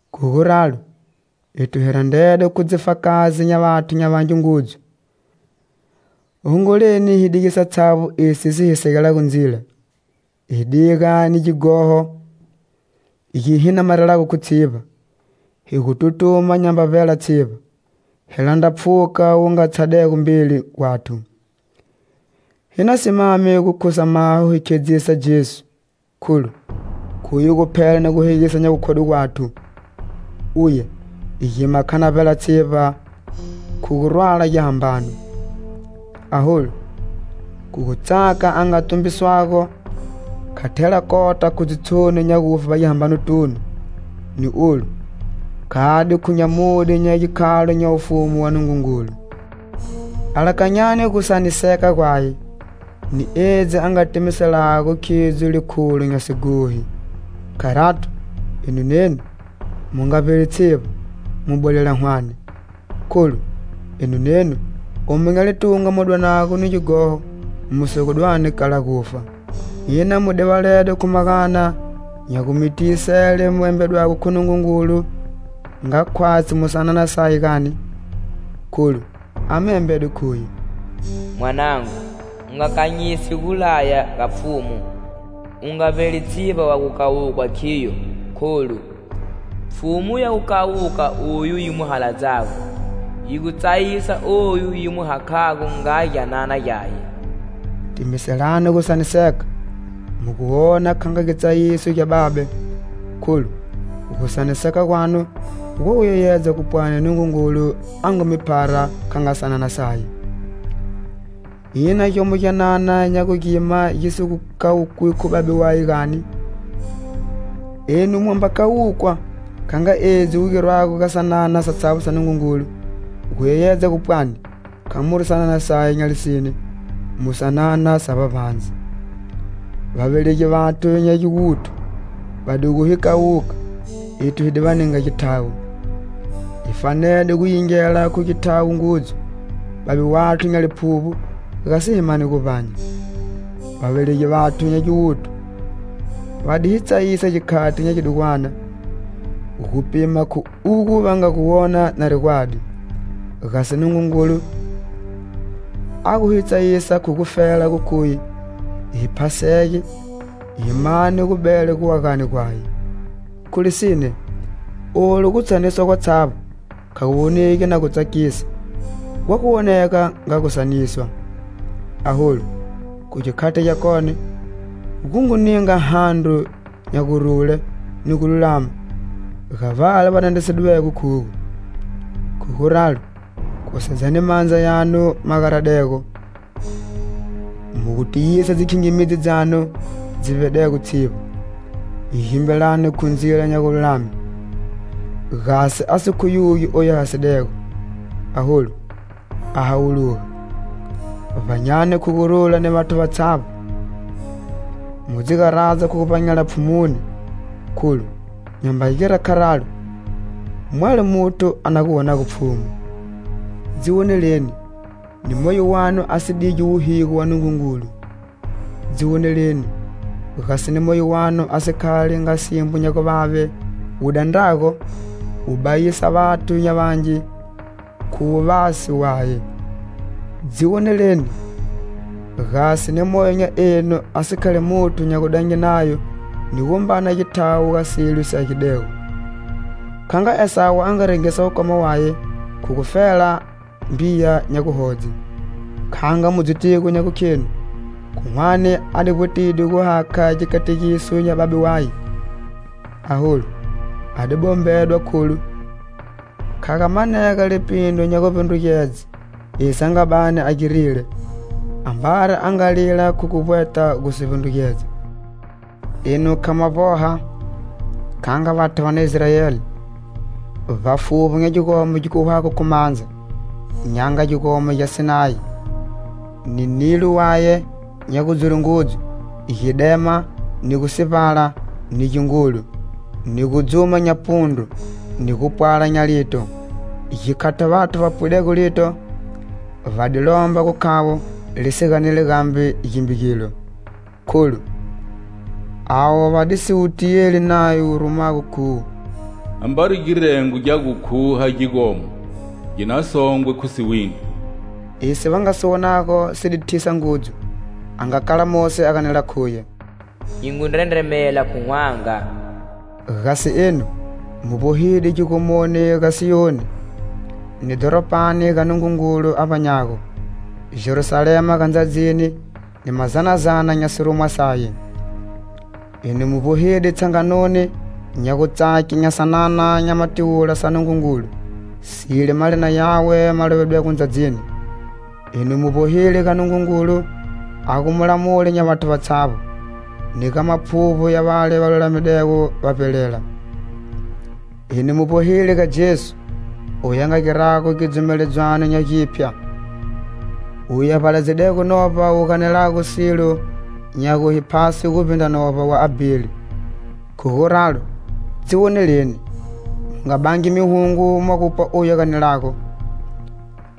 Khu guralo, ethu hi randredwe khu dzifakazi nya vathu nya vangi ngudzu. Hongoleni hi dige satshavbo esi si hi segelago ndzila, hi diga ni gighoho gi hi namarelago khu tshivba, hi gu tutuma nyamba vbela tshivba, hi landra pfhuka wu nga tshadego mbeli gwathu. Hi na simame gu khusa maho hi khedzisa Jesu, kholu, khuye guphela ni guhegisa nya gukhodwe gwathu. Uye gima kha vbela tshivba khu gu rwala gihambano. Aholu, khu gutsaka a nga tumbiswago, kha thela kota khu dzitshoni nya gufe vbagihambanotunu ni olu, khade khu nyamudye nya gikhalo nya wufumu wa Nungungulu. Alakanyani gusaniseka gwaye, ni edzi a nga timiselago khidzo likhulo nya sighohi. Kharato, enu nenu mu nga vbeli tshivba, mu bwelelela hwane. Kholu, enu nenu omu nya litunga mu dwanago ni gighoho, mu si gu dwani kala gufa. Ina mu divaledwe khu magana nya gu mi tiyisele mu embedwego khu Nungungulu nga khwatshi mu sanana saye gani? Kholu, a mi embede khuye: "Mwanangu, u nga kanyisi gulaya ga Pfhumu; u nga vbeli tshivba wa gu kawukwa khiyo, kholu, Pfhumu ya gu kawuka oyu yi mu haladzago, yi gu tsayisa oyu yi mu hakhago nga gyanana gyaye." Timiselani gusaniseka, mu gu wona kha nga gitsayiso gya babe, kholu gusaniseka gwanu gwa gu yeyedza gu pwani Nungungulu a ngu mi phara kha nga sanana saye. Ina gyomo gyanana nya gu gima gi si gu kawukwi khu babe waye, gani? Enu mwa mba kawukwa kha nga edzi gu girwago ga sanana satshavbo sa Nungungulu, gu yeyedza gu pwani kha muri sanana saye nya lisine, mu sanana sa vbavbandze. Vavelegi vathu nya giwuthu va di gu hi kawuka, ethu hi di va ninga githawo. Hi fanede gu yingela khu githawo ngudzu Babe wathu nya liphuvbo, gasi hi mane guvbanya. Vavelegi vathu nya giwuthu va di hi tsayisa gikhati nya gidugwanana, gu pima khu ugo va nga gu wona nari gwadi, gasi Nungungulu, a gu hi tsayisa khu gufela gu khuye hi phasege, hi mana gu bela guagani gwaye. Khu lisine, olu gutsayiswa gwatshavbo kha gu wonegi na gu tsakisa, gwa gu wonega nga gusaniswa. Aholu, khu gikhati gyakone, gu ngu ninga handro nya gurule ni gululama ga vale va dandrisidwego khugo. Khu guralo, khusedzani mandza yanu ma garadego, mu gu tiyisa dzikhingimidzi dzanu dzi vbedego tshivba. Gimbilani khu dzindzila nya gululame, gasi a si khuyugi oyu a hasidego, aholu, a hawuluga. Vbanyani khu gurula ni vathu vatshavbo, mu dzi garadza khu guvbanyela Pfhumuni, kholu nyamba gira kharalo, mwalo muthu a na gu wonago Pfhumu. Dzi woneleni, ni moyo wanu a si digi wuhigo wa Nungungulu. Dzi woneleni, gasi ni moyo wanu a si khali nga simbo nya guvave wu dandrago, wu bayisa vathu nya vangi khu wuvasi waye. Dzi woneleni, gasi ni moyo nya enu a si khali muthu nya gudange nayo ni gumbana githawo ga silo si agidego, kha nga Esawu a nga rengisa wukoma waye khu gufela mbiya nya guhodze. Kha nga mu dzitigo nya gukhenu, khu hwane a di vbwetide gu hakha gikategiso gya babe waye, aholu a di bombedwa kholu, kha ga manega lipindru nya guvbindrugedze esi a nga bani a girile, ambari a nga lila khu gu vbweta gu si vbindrugedza. Enu kha mwa vboha, kha nga vathu va na Israeli, vbafuvbi nya gigomo gi kuhwago khu mandza, nya nga gigomo gya Sinayi, ni nilo waye nya gudzure ngudzu, gidema, ni gusivbala, ni gingulu, ni gudzuma nya pundru, ni gupwala nya lito. Gikhati vathu va pwidego lito, va di lomba gu khavo li si ganeli gambe gimbe gilo. Kholu, avo va di si wu tiyeli nayo wu rumago khuwo "Ambari girengo gya gu kuha gigomo, gi na songwe khu siwindri." Esi va nga si wonago si di thisa ngudzu, a nga kala Mosi a ganela khuye: "Nyi ngu ndrendremela khu hwanga." Gasi enu, mu vbohide gigomoni ga Siyoni, ni dhoropani ga Nungungulu a vbanyago, Jerusalema ga ndzadzini ni mazanazana nya sirumwa saye. Enu mu vbohide tshanganoni nya gutsake nya sanana nya matiwula sa Nungungulu, sile malina yawe ma lovidwego ndzadzini. Enu mu vbohile ga Nungungulu a gu mulamuli nya vathu vatshavbo, ni ga maphuvbo ya vale va lulamidego va vbelela. Enu mu vbohile ga Jesu oyu a nga girago gidzumeledzwano nya giphya, uye a vbaladzidego Novba wu ganelago silo nya gu hi phase guvbindra novba wa Abheli. Khu guralo, dzi woneleni! Mu nga bangi mihungo mwa gupwa oyu a ganelago.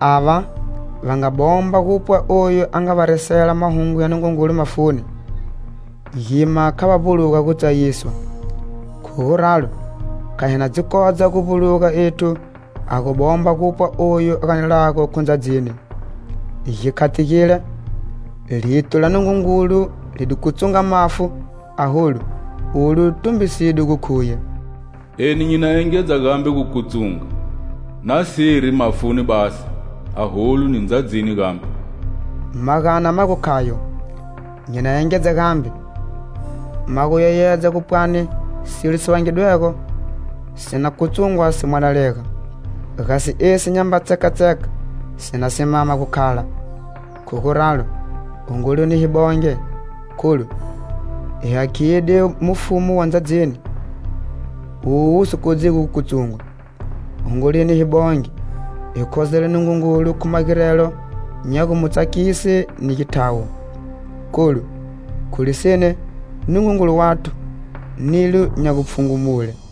Ava va nga bomba gupwa oyu a nga va resela Mahungu ya Nungungulu mafuni, gima kha va vbuluga gutsayiswa. Khu guralo, kha hi na dzi kodza guvbuluga ethu ha gu bomba gupwa oyu a ganelago khu ndzadzini. Gikhati gile, lito la Nungungulu li di kutsunga mafu, aholu, olu tumbiside gu khuye: "Eni nyi na engedza gambe gu kutsunga, nasiri mafuni basi, aholu, ni ndzadzini gambe." Magana ma gu khayo: "Nyi na engedza gambe" ma gu yeyedza gu pwani silo si vangidwego, si na kutsungwa si mwalalega. Gasi esi nyamba tsekatseka, si na simama gu khala. Khu guralo, hongoleni hi bonge, kholu, hi hakhide mufumu wa ndzadzini owu wu si kodzigo gu kutsungwa. Hongoleni hi bonge, hi khozela Nungungulu khu magirelo nya gu mu tsakise ni githawo. Kholu, khu lisine, Nungungulu wathu nilo nya gupfhungumule.